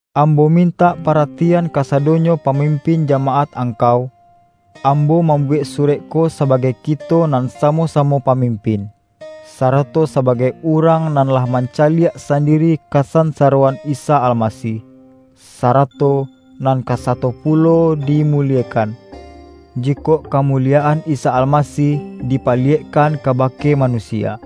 Ambo mintak paratian kasado-nyo pamimpin jamaat angkau. Ambo mambuwek surek ko sabagai kito nan samo-samo pamimpin, sara-to sabagai urang nan lah mancaliak sandiri kasansaroan Isa Almasih, sara-to nan ka sato pulo dimuliekan, jikok kamuliyaan Isa Almasih dipaliyekkan kabake manusia.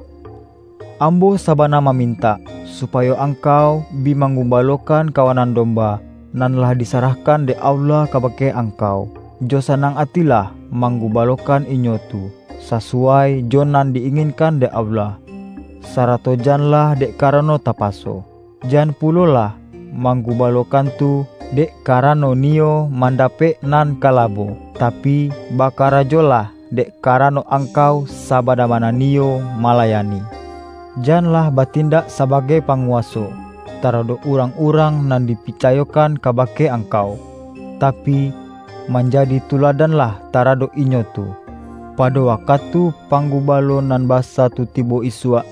Ambo sabana ma-mintak, supayo angkau bi manggu-balokan kawanan domba, nan lah di-sarahkan dek Allah kabake angkau. Jo sanang atilah manggubalokan inyo tu, sasuwai jo nan di-inginkan dek Allah, sarato janlah dek karano tapaso. Jan pulolah manggubalokan tu, dek karano niyo mandapek nan ka labo, tapi, bakarajolah dek karano angkau sabana-bana niyo malayani. Janlah batindak sabagai panguwa-so, taradok urang-urang nan dipica-yokan kabake angkau, tapi, manja-di tuladanlah taradok inyo tu. Pado wakatu Panggubalo Nan Basa tu tibo isuak,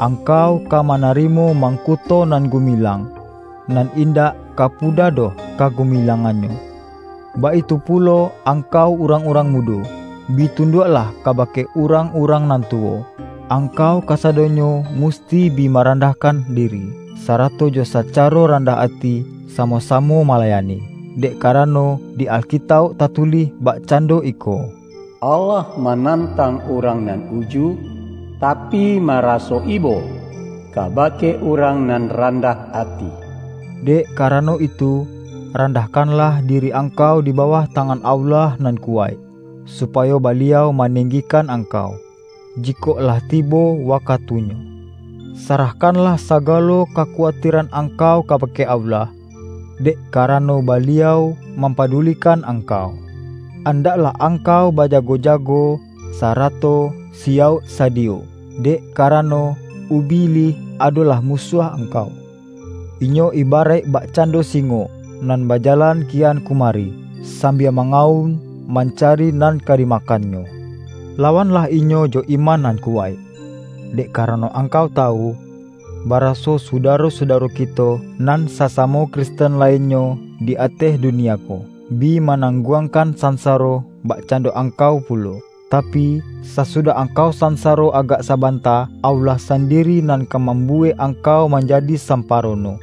angkau ka manarimo mangku-to nan gumilang, nan indak ka puda doh kagumilangannyo. Baitu pulo angkau urang-urang mudo. Bi tunduaklah kabake urang-urang nan tuwo. Angkau kasadonyo musti bi marandahkan diri, sarato jo sacaro randah ati, samo-samo mala-yani. Dek karano, di Alkitauk tatu-lih bakcando iko,”Allah manantang urang nan uju, tapi, maraso ibo ka-bake urang nan randah ati.” Dek ka-rano itu, randahkanlah diri angkau di bawah tangan Allah nan kuwaik, supayo Baliau manenggikan ang-kau, jikok lah tibo wakatunyo. Sa-rahkanlah sagalo kakuwatiran ang-kau kabake Allah, dek karano, Baliau mampadulikan angkau. Andaklah angkau bajago-jago, sa-rato siyauk sadiyo! Dek karano, Ubi-lih adolah musuah angkau. Inyo iba-raik bakcando singo, nan bajalan kian kumari, sambia mangawun mancari nan ka dimakannyo. Lawanlah inyo jo iman nan kuwaik, dek karano angkau tawu, baraso sudaro-sudaro kito, nan sasamo Kristen lainnyo di ateh dunia ko, bi manangguangkan sansa-ro bakcando angkau pulo. Tapi, sa-sudah angkau sansaro agak sabanta, Allah sandiri nan ka mambuwek ang-kau manjadi samparono.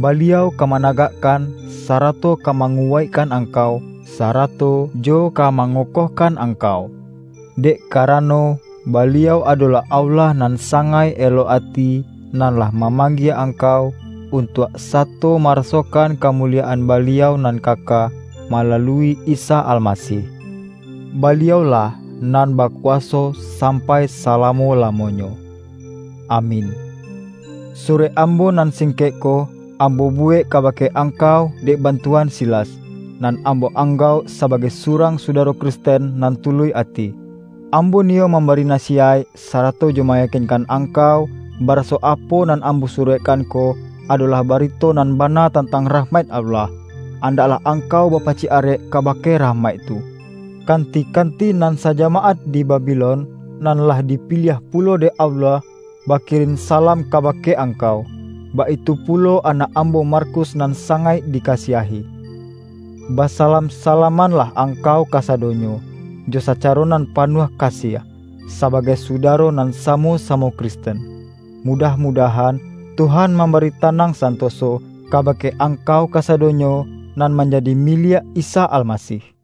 Baliau ka managakkan, sarato ka manguwaik-kan angkau, sarato jo ka mangokoh-kan angkau. Dek karano, Baliau ado-lah Allah nan sangaik elok ati, nan lah mamanggie angkau, untuak sa-to marasokan kamuliyaan Baliau nan kaka, malalui Isa Almasih. Baliau-lah nan bakuwaso sampai salamo-la-monyo! Amin! Surek ambo nan singkek ko, am-bo buwek kabake angkau dek bantuan Silas, nan ambo anggauk sabagai surang sudaro Kristen nan tuluih ati. Ambo niyo mambari nasiyaik, sara-to jo mayakinkan angkau, baraso apo nan ambo surekkan ko, adolah barito nan bana tantang rahmaik Allah. An-daklah angkau bapacik arek kabake rahmaik tu. Kanti-kanti nan sajamaat di Babi-lon, nan lah dipiliah pulo dek Allah, ba-kirin salam kabake angkau; baitu pulo anak ambo Markus nan sangaik dika-siahi. Basalam-salamanlah angkau kasadonyo, jo sacaro nan panuah ka-siah, sabagai sudaro nan samo-samo Kristen. Mudah-mudahan, Tuhan mamba-ri tanang santoso, kabake angkau ka-sadonyo nan manjadi miliak Isa Al-masih.